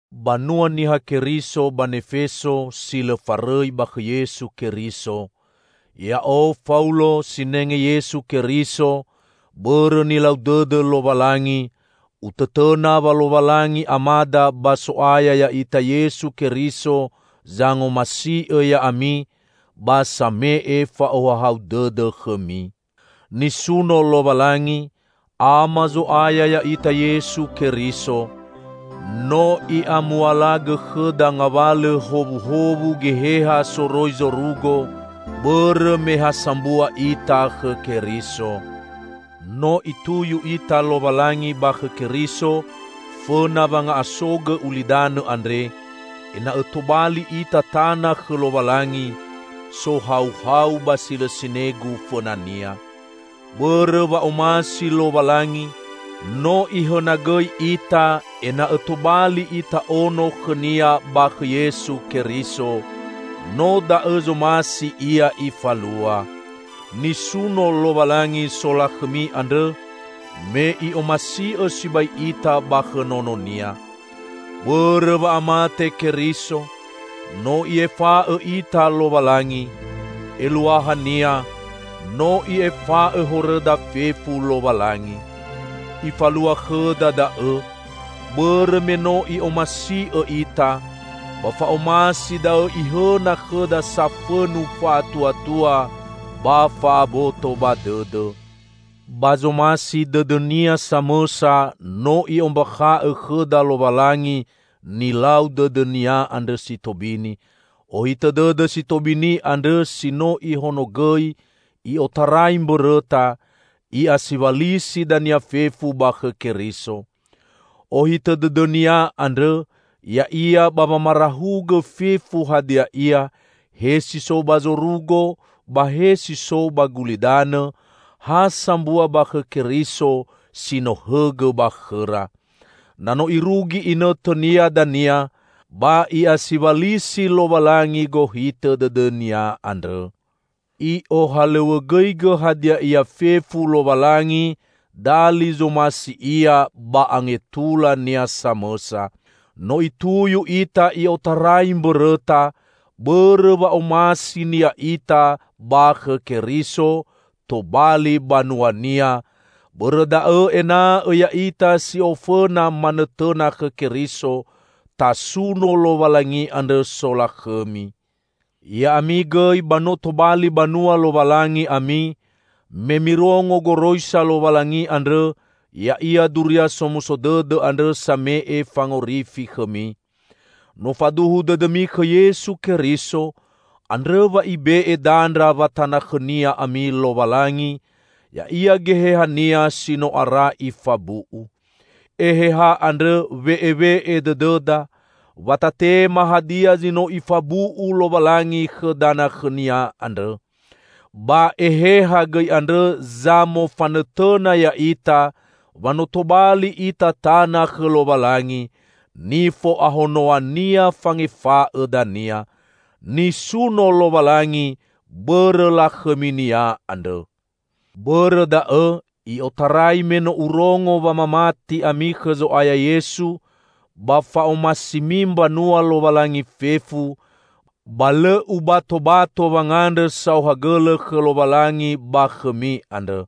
Banua Niha Keriso ba Nefeso, si lõ farõi ba khõ Yesu Keriso! Ya'o, Faulo, sinenge Yesu Keriso, bõrõ nilau dõdõ Lowalangi, utõtõna wa Lowalangi Amada ba So'aya ya'ita Yesu Keriso zangomasi'õ ya'ami ba same'e fa'ohahau dõdõ khõmi. Nisuno Lowalangi, Ama Zo'aya ya'ita Yesu Keriso! No I'amualagõ khõda ngawalõ howuhowu Geheha soroi zorugo, bõrõ me ha sambua ita khõ Keriso. No Ituyu ita Lowalangi ba khõ Keriso, fõna wanga'asogõ ulidanõ andre, ena'õ tobali ita tana khõ Lowalangi, sohauhau ba si lõ sinegu fõna-Nia. Bõrõ wa'omasi Lowalangi, no Ihõnogõi ita, ena'õ tobali ita ono khõ-Nia, ba khõ Yesu Keriso. No da'õ zomasi Ia Ifalua. Nisuno Lowalangi solakhõmi andrõ me I'omasi'õ sibai ita ba khõ Nono-Nia. Bõrõ wa'amate Keriso, no I'efa'õ ita Lowalangi; eluahania no I'efa'õ horõda fefu Lowalangi. I'falua khõda da'õ, bõrõ me no I'omasi'õ ita, ba fa'omasi da'õ Ihõna khõda safõnu fa'atuatua ba fa'aboto ba dõdõ. Ba zomasi dõdõ-Nia samõsa, no I'ombakha'õ khõda Lowalangi nilau dõdõ-Nia andrõ si tobini; ohitõ dõdõ si tobini andrõ si no Ihonogõi i'otarai mbõrõta, I'asiwalisi dania fefu ba khõ Keriso. Ohitõ dõdõ-Nia andrõ ya'ia ba wamarahugõ fefu hadia ia, he si so ba zorugo ba he si so ba gulidanõ, ha sambua ba khõ Keriso si no hõgõ ba khõra. Na no irugi inõtõnia dania ba I'asiwalisi Lowalangi gohitõ dõdõ-Nia andrõ. I'ohalõw̃õgõigõ hadia ia fefu Lowalangi dali zomasi Ia ba angetula-Nia samõsa. No Ituyu ita i'otarai mbõrõta, bõrõ wa'omasi-Nia ita ba khõ Keriso, tobali banua-Nia; bõrõ da'õ, ena'õ ya'ita si ofõna manõtõna khõ Keriso, tasuno Lowalangi andrõ solakhõmi! Ya'ami gõi ba no tobali banua Lowalangi ami, me mirongo goroisa Lowalangi andrõ, ya'ia Duria Somuso Dõdõ andrõ same'e fangorifi khõmi. No faduhu dõdõmi khõ Yesu Keriso, andrõ wa Ibe'e dandra wa tana khõ-Nia ami Lowalangi, ya'ia Geheha-Nia si no ara Ifabu'u. Eheha andrõ we'ewe'e dõdõda, wa tatema hadia zi no Ifabu'u Lowalangi khõ dana khõ-Nia andrõ. Ba Eheha gõi andrõ zamofanõtõna ya'ita, wa no tobali ita tana khõ Lowalangi, nifo'ahonoa-Nia fangefa'õ dania. Nisuno Lowalangi bõrõ lakhõmi-Nia andrõ! Bõrõ da'õ, i'otarai me no urongo wa mamati ami khõ Zo'aya Yesu, ba fa'omasimi mbanua Lowalangi fefu, ba lõ ubatobato wangandrõ saohagõlõ khõ Lowalangi ba khõmi andrõ.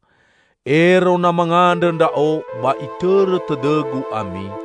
Ero na mangandrõ ndra'o ba itõrõ tõdõgu ami.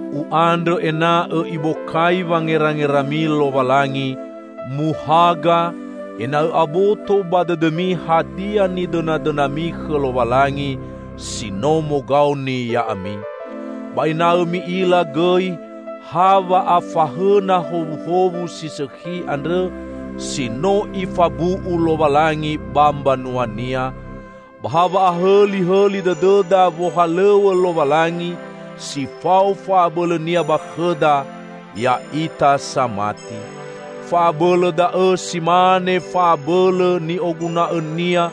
U'andrõ ena'õ Ibokai wangerangerami Lowalangi, muhaga; ena'õ aboto ba dõdõmi hadia nidõnadõnami khõ Lowalangi, si no mogaoni ya'ami. Ba ena'õ mi'ila gõi ha wa'afahõna howuhowu si sõkhi andrõ, si no Ifabu'u Lowalangi ba mbanua-Nia; ba ha wa'ahõlihõli dõdõda wohalõw̃õ Lowalangi si fao fa'abõlõ-Nia ba khõda, ya'ita samati. Fa'abõlõ da'õ si mane fa'abõlõ ni'oguna'õ-Nia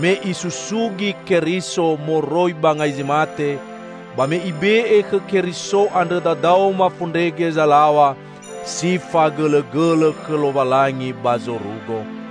me Isusugi Keriso moroi ba ngai zi mate, ba me Ibe'e khõ Keriso andrõ dadaoma fondrege zalaw̃a si fagõlõgõlõ khõ Lowalangi ba zorugo.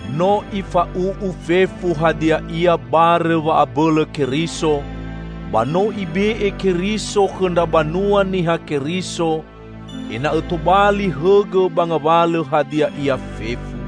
No Ifa'u'u fefu hadia ia barõ wa'abõlõ Keriso, ba no Ibe'e Keriso khõ ndra banua Niha Keriso, ena'õ tobali hõgõ ba ngawalõ hadia ia fefu.